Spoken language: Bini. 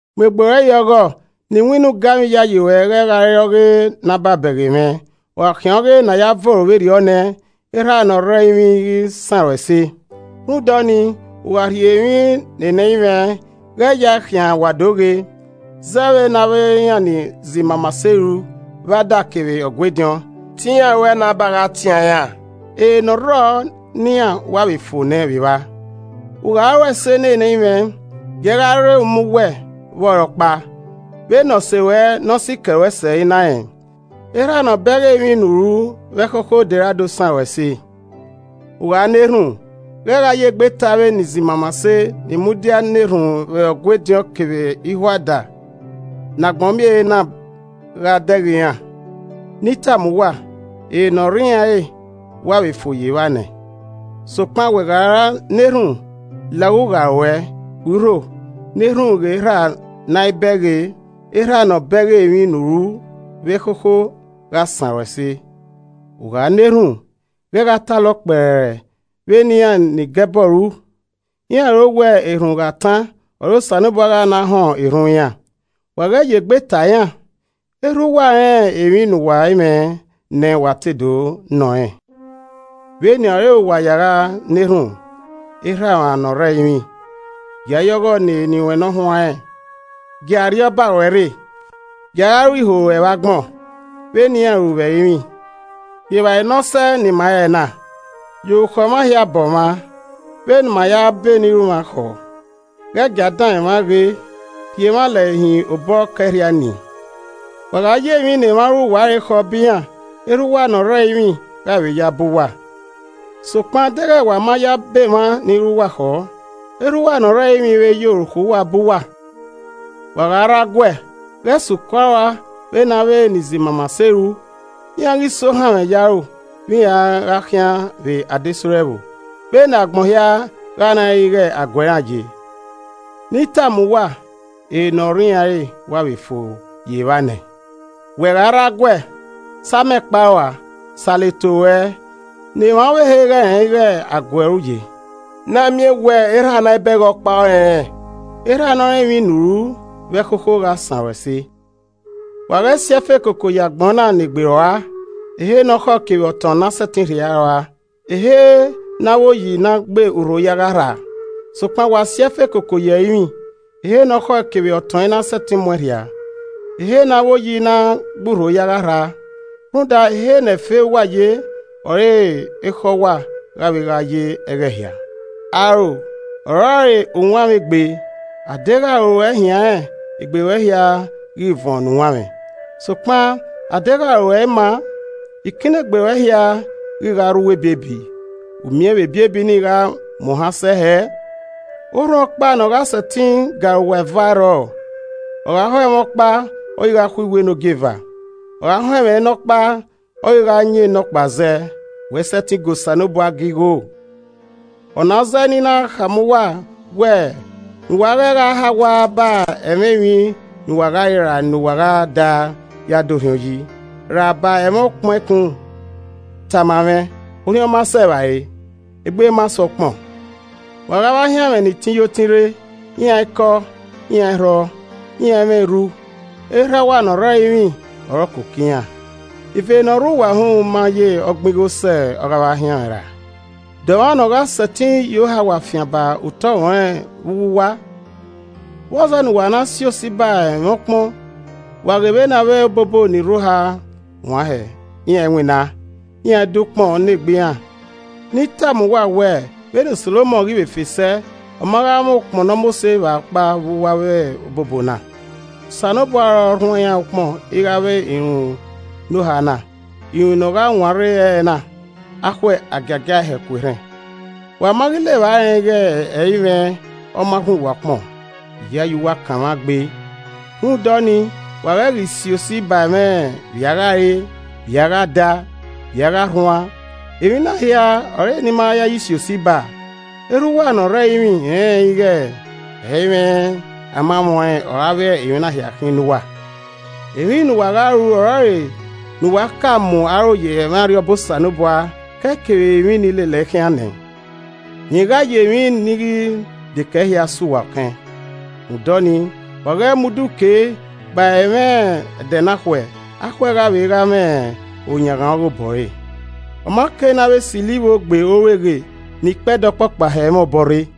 “Mu egbe ruẹ ye ọghọ ne iwinna ugamwẹ iyayi ruẹ ghẹ gha re ọghe nababẹghe mwẹ, ọ gha khian ọghe ne a ya voro vberriọ nẹ, Erhaa ne ọ rre ẹrinmwi i ghi san ruẹ ẹse. “Rhunmwuda ọnii, u gha rhie emwi ne nẹi mwẹ, ghẹ yae khian wa do ghe, zẹ vbe ne avbe iran ni zẹ imamase ru vbe ada kevbe Ọgua ediọn. Te iran ruẹe ne a ba gha tian iran. Ere ne ọ rrọọ ne iran wa vbe fo nẹ vbe vba. U gha ru ẹse ne nẹi mwẹ, giee gha re uma uwẹ vbe ọre ọkpa, vbe ne ose ruẹ ne ọ sikẹ ruẹ sẹ i na rẹn. Erhaa ne ọ bẹghe emwi ne u ru vbe ẹkhokho de ra do san ruẹ ẹse. “U gha na erhunmwu, ghẹ ya egbe ta avbe ni zẹ imamase ni mudia na erhunmwu vbe Ọgua ediọn kevbe ihuada ne agbọn miẹn ehe na gha dẹghe iran, Ne I tama uwa, ere ne ọ rre iran re wa vbe fo ye evba nẹ. Sokpan wẹ gha ra na erhunmwu, la ughugha ruẹ, khui urho, na erhunmwu ghe Erhaa ne a i bẹghe. Erhaa ne ọ bẹghe emwi ne u ru vbe ẹkhokho, gha san ruẹn ẹse. “U gha na erhunmwu, ghẹ gha talọ kpẹrẹ vbe ne iran ne enigẹbọ ru. Iran ro wẹẹ erhunmwu gha tan ọre Osanobua gha na họn erhunmwu iran. Wa ghẹ ye egbe ta iran. Erha uwa rẹn emwi ne uwa i mwẹ nẹ wa te do nọ rẹn. Vbenian ọre uwa ya gha na erhunmwu, “ ‘Erha mwa ne ọ rre ẹrinmwi: Gia ya ọghọ ne eni ruẹ nọhuanrẹn, gie Arriọba ruẹ rre, gia gha ru iho ruẹ vbe agbọn vbe ne iran ru vbe ẹrinmwi. Rhie evbare ne ọ sẹe ne ima ẹre na. Ya orukhọ mwa hia bọ mwa, vbe ne ima ya bọ enirumwakhọ. Ghẹ gia danmwẹ mwa ghe, rhie mwa lẹre hin obọ Ọkaẹrhia Nii.’ “Wa gha ya emwi ne emwa ru uwa re khọ bọ iran, erha uwa ne ọ rre ẹrinmwi gha vbe ya bọ uwa. Sokpan, deghẹ wa ma ya bọ emwa ni ru uwa khọọ, Erha uwa ne ọ rre ẹrinmwi i vbe ya orukhọ uwa bọ uwa. “Wẹ gha rre aguẹ, ghẹ suku aro ua vbene avbe ni zẹ imamase ru. Iran ghi sẹ ohanmwẹ ye aro vbe iran a gha khian vbe adesẹ ore ẹvbo, vbene agbọn hia gha na rẹn ighe aguẹ iran ye. Ne I tama uwa, ere ne ọ rre iran re wa vbe fo ye evba nẹ. Wẹ gha rre aguẹ, sa amẹ kpe aro ua, salọ eto ruẹ, ne emwa ọvbehe ghẹ rẹn ighe aguẹ ọre u ye, na miẹn wẹ Erhaa ne a i bẹghe ọkpa ọre ọ rẹnrẹn. Erhaa ne ọ rẹn emwi ne u ru vbe ẹkhokho gha san ruẹn ẹse. “Wa ghẹ si ẹfe koko ye agbọn na ne egbe ruẹ, ehe ne ọkhọe kevbe ọtọn na sẹtin rhia rua, ehe ne avbe oyi na gbe urho ya gha rhaa. Sokpan wa si ẹfe koko ye ẹrinmwi, ehe ne ọkhọe kevbe ọtọn i na sẹtin mu ẹn rhiaa, ehe ne avbe oyi i na gbe urho ya gha rhaa. Rhunmwuda ehe ne ẹfe uwa ye ọre ekhọe uwa gha vbe gha ye ẹghẹ hia. “Aro ọrọre uwanmwẹ egbe, a deghẹ aro ruẹ hianrẹn, egbe ruẹ hia ghi vuọn ne uwanmwẹ. Sokpan a deghẹ aro ruẹ i maa, ikinnegbe ruẹ hia ghi gha rre uwu ebiebi, u miẹn vbe ebiebi ni gha mu ohan sẹ hẹẹ! “Orhunmwu ọkpa ne ọ gha sẹtin ga arowa eva, ẹ i rrọọ. Ọ gha ho ẹmwẹ ọkpa, ọ ghi gha khuiwu enogieva, ọ gha họn ẹmwẹ ne ọkpa, ọ ghi gha yan enọkpa zẹ, wẹ i sẹtin ga Osanobua ga igho. “Ọ na ọ zẹẹ ne I na khama uwa wẹẹ, ne uwa ghẹ hagha ba ẹmwẹ emwi ne uwa gha re ra ne uwa gha da ya da orhiọn yi, ra ba ẹmwẹ ukpọn ẹkun. Tama mwẹ, orhiọn ma sẹ evbare? Egbe ma sẹ ukpọn? Wa ghe avbe ahianmwẹ ni tin yo tin rre. Iran i kọ, iran i rhọ, iran i mwẹ erru. Erha uwa ne ọ rre ẹrinmwi ọre ọ koko iran. Ive ne ọ rre uwa uhunmwu ma ye ọgbin igho sẹ ọghe ahianmwẹ ra! De ọmwa ne ọ gha sẹtin ye ohawa fian ba utọmwẹ ọnrẹn vbe uwu uwa? “Vbọzẹ ne uwa na si osi ba ẹmwẹ ukpọn? Wa ghe vbene avbe obobo ni rre oha wan hẹẹ, iran i winna, iran i do ukpọn ne egbe iran. Ne I tama uwa wẹẹ, vbene Solomọn ghi vbe fe sẹ, ọ ma gha mwẹ ukpọn ne ọ mose vba ọkpa vbe uwu avbe obobo na. Osanobua ọre ọ rhuan iran ukpọn ighe avbe irunmwu ne oha na, irunmwu nọ gha wan rre ẹre na, akhuẹ a giagiae hẹ ku erhẹn. Wa ma ghi la evba rẹn ighe ẹ i mwẹ ọ ma rhuan uwa ukpọn! Iyayi uwa kanmwa gbe. “Rhunmwuda ọnii, wa ghẹ ghi si osi ba ẹmwẹ vbia gha re e? Vbia gha da? Vbia gha rhuan? (Emwi na hia ọre enimayayi si osi ba.) Erha uwa ne ọ rre ẹrinmwi rẹnrẹn ighe ẹ i mwẹ amamwẹ ọnrẹn avbe emwi na hia khin ne uwa. Emwi ne uwa gha ru ọrọre ne uwa ka mu aro ye ẹmwẹ Arriọba Osanobua kẹe kevbe emwi ni lelẹe khian nẹ, rẹn gha ye emwi ni ghi dekẹe hia sẹ uwa ọkẹn. Rhunmwuda ọnii, wa ghẹ mu udu kee ba ẹmwẹ ẹdẹ na khuẹ. Akhuẹ gha vbe gha mwẹ oyanghan ọghe obọ re. Ọma kei ne a vbe silo ivboo gbe orueghe ne ikpẹdẹ ọkpọkpa hẹ mwẹ obọ rre.